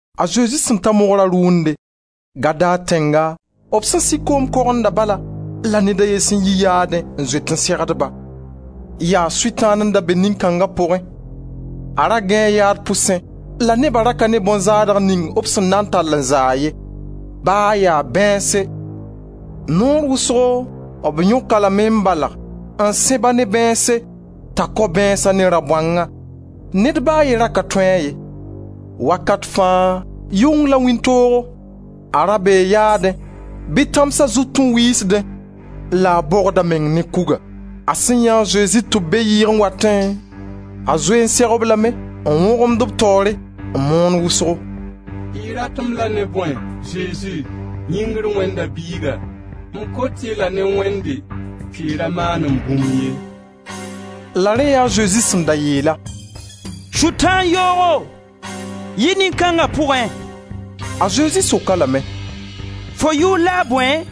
A Zezi sẽn ta mogra rʋʋnde, Gadar tẽnga. B sẽn sig koom kogenda bala, la ned a ye sẽn yi yaadẽ n zoet n segd-ba. Yaa Sʋtãan n da be nin-kãng pʋgẽ. A ra gãee yaad pʋsẽ la neba ra ka ne bõn-zaadg ning b sẽn na n tall n zaa-a ye, ba ya bãeense. Naoor wʋsgo b yõk-a lame n balg, n sẽb-a ne bãeense t'a kao bãeensã ne rabõangã; ned ba a ye ra ka tõe-a ye. Wakat fãa, yʋng la wĩntoogo, a ra bee yaadẽ bɩ tãmsa zut n wiisdẽ la a bogd a meng ne kuga. A sẽn yãe a Zezi tɩ b be yɩɩg n watẽ, a zoe n seg-b lame, n wõgemd b taoore n moon wʋsgo: «Y rat-m la ne bõe, Zezi, yĩngr Wẽnda Biiga? M kot-y la ne Wẽnde, tɩ y ra maan-m bũmb ye!» La rẽ yaa a Zezi sẽn da yeel-a: «Sʋtãan yoogo, yi nin-kãnga pʋgẽ.» A Zezi sok-a lame: «Fo yʋʋr la a bõe?»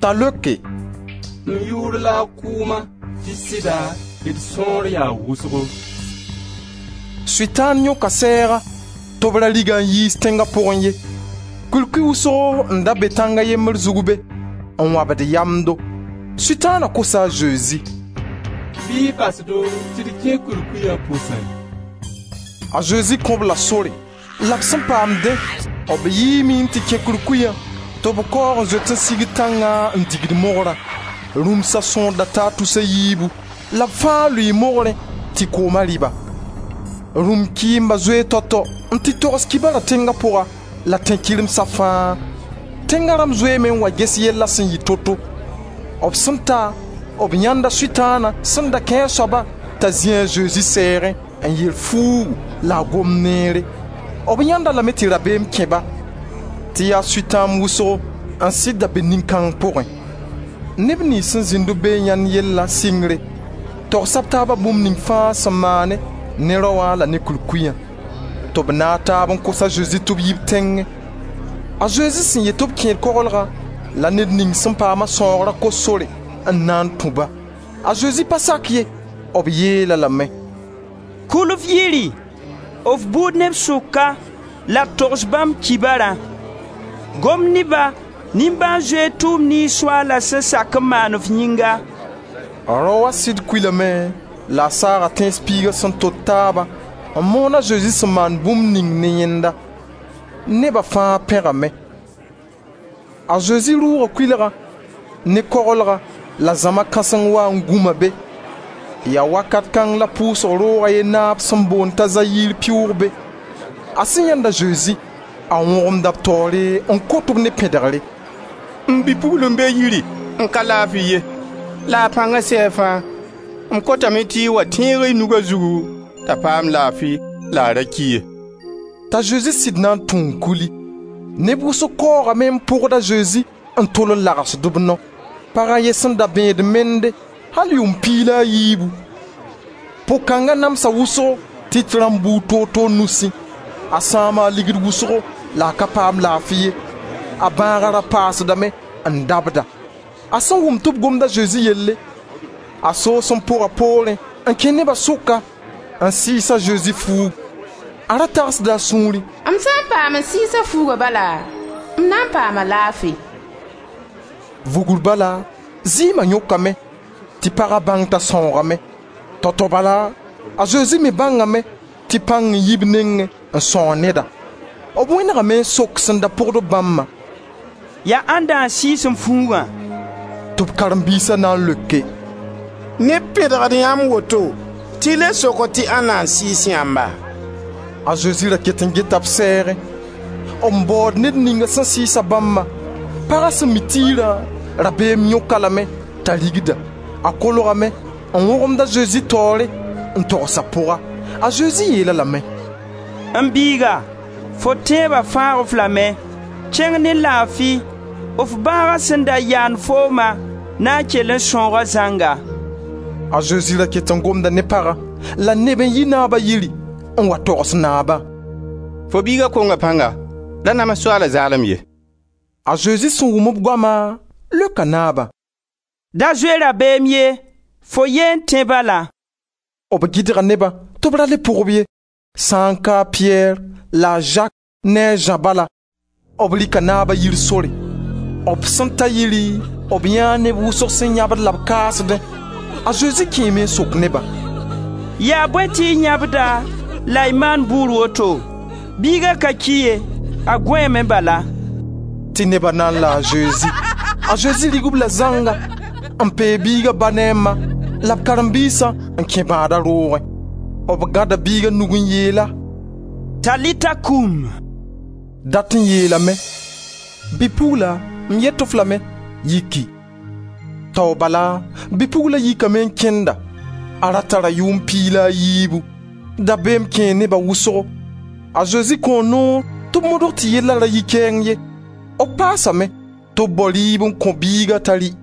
T'a leoke: «M yʋʋr la a Kʋʋma, tɩ sɩda, d sõor yaa wʋsgo.» Sʋtãan yõka sɛɛga tɩ b ra rig-a n yiis tẽnga pʋgẽ ye. Kurkuy wʋsgo n da be tãng a yembr zug be, n wãbd yamdo. Sʋtãana kosa a Zezi: «Bɩ y bas do tɩ d kẽ kurkuya pʋsẽ.» A Zezi kõ-b la sore, la b sẽn paam dẽ, b yiime n tɩ kẽ kurkuya tɩ b kaoog n zoet n sigd tãngã n digd mogrã. Rũmsa sõor da taa tus a yiibu la b fãa lʋɩɩ mogrẽ tɩ kooma rɩ-ba. Rũm-kɩɩmba zoee tao-tao n tɩ togs kibara tẽnga pʋga la tẽn-kɩremsa fãa. Tẽnga rãmb zoeeme n wa ges yellã sẽn yɩ to-to. B sẽn ta, b yãenda Sʋtãana sẽn da kẽ-a soabã t'a zĩ a Zezi sɛɛgẽ n yer fuug la a gomd neere. B yãend-a lame tɩ rabeem kẽ-ba tɩ yaa sʋtãamb wʋsgo n sɩd da be nin-kãng pʋgẽ. Neb niyns sẽn zĩnd-b be n yãend yella sɩngre, togsa b taaba bũmb ning fãa sẽn maane ne raoã la ne kurkuya. Tɩ b naag taab n kos a Zezi tɩ b yi b tẽngẽ. A Zezi sẽn yet tɩ b kẽed koglgã, la ned ninga sẽn paam-a sãoogra kos sor n na n tũ-ba. A Zezi pa sak ye; b yeel-a lame: «Kul f yiri, f buud neb sʋka, la togs bãmb kibarã; gom ne-ba, nimbãan-zoeer tʋʋm niyns Soaala sẽn sak n maan f yĩnga.» Raoã sɩd kulame la a saaga Tẽns piiga sẽn tot taabã n moond a Zezi sẽn maan bũmb ning ne yẽnda. Neba fãa pẽgame. A Zezi rʋʋga kʋɩlgã ne koglgã la zãma kãseng waa n gũma be. Yaa wakat kãng la pʋʋsg roog a ye naab sẽn boond t'a Zayir pɩʋʋg be. A sẽn yãend a Zezi, a wõgemda b taoore n kot-b ne pẽdgre: «M bi-pugl n be yiri n ka laafi ye, la a pãnga sɛɛ fãa, m kotame tɩ y wa tẽeg y nug a zugu t'a paam laafi la a ra ki ye.» T'a Zezi sɩd na n tũ n kuli. Neb wʋsg kaoogame n pʋgd a Zezi n tol n lagsd b nao. Pag a ye n da bẽed mende, al yʋʋm piig la a yiibu. Pʋg-kãnga namsa wʋsgo tɩt rãmba buud toor-toor nusẽ. A sãama ligd wʋsgo la a ka paam laafi ye. A bãaga da paasdame n dabda. A sẽn wʋm tɩ b gomd a Zezi yelle, a soos n pʋga poorẽ n kẽ neba sʋka, n sɩɩs a Zezi fuugu. A ra tagsda a sũurẽ: «M sã n paam n sɩɩs a fuuga bala, m na n paama laafi.» Vugr bala zɩɩma yõkame tɩ paga bãng t'a sãoogame. Tao-tao bala, a Zezi me bãngame tɩ pãng n yi b nengẽ n sãoog neda. B wẽnegame n sok sẽn da pʋgd-b bãmbã: «Yaa ãnda n sɩɩs m fuugã?» Tɩ b karen-biisa na n leoke: «Neb pẽdgd yãmb woto tɩ y le sokd tɩ ãnda n sɩɩs yãmba?» A Zezi ra ket n geta b sɛɛgẽ, n baood ned ninga sẽn sɩɩs-a bãmbã. Paga sẽn mi tiirã, rabeem yõk-a lame t'a rigda. A kolgame n wõgemd a Zezi taoore n togs a pʋga. A Zezi yeel-a lame: «M biiga, fo tẽeba fãag-f lame. Kẽng ne laafi, f bãaga sẽn da yaand fooma na n kell n sãooga zãnga.» A Zezi ra ket n gomda ne pagã, la neb n yi naaba yiri n wa togs naaba: «Fo biiga konga pãnga, ra nams Soaala zaalem ye!» A Zezi sẽn wʋm b goama leoka naabã: «Da zoe rabeem ye, fo ye n tẽ bala.» B gɩdga neba tɩ b ra le pʋg-b ye, sã n ka a Piyɛr la a Zak ne Zã bala. B rɩka naaba yir sore; b sẽn ta yiri b yãee neb wʋsg sẽn yãbd la b kaasdẽ. A Zezi kẽeme n sok nebã: «Yaa bõe tɩ y yãbda la y maand bʋʋr woto? Biiga ka ki ye, a gõeeme bala.» Tɩ neba na n la a Zezi. A Zezi rig-b la zãnga, n peeg biiga ba ne a ma la b karen-biisã n kẽ bãada roogẽ. B gãda biiga nug n yeel-a: «Talita koum!» Dat n yeelame: «Bi-pugla, m yet-f lame, yiki!» Tao bala bi-pugla yikame n kẽnda. A ra tara yʋʋm piig la a yiibu. Dabeem kẽe nebã wʋsgo. A Zezi kõo noor tɩ b modg tɩ yella ra yi kɛɛng ye. B paasame tɩ b bao rɩɩb n kõ biiga t'a rɩ.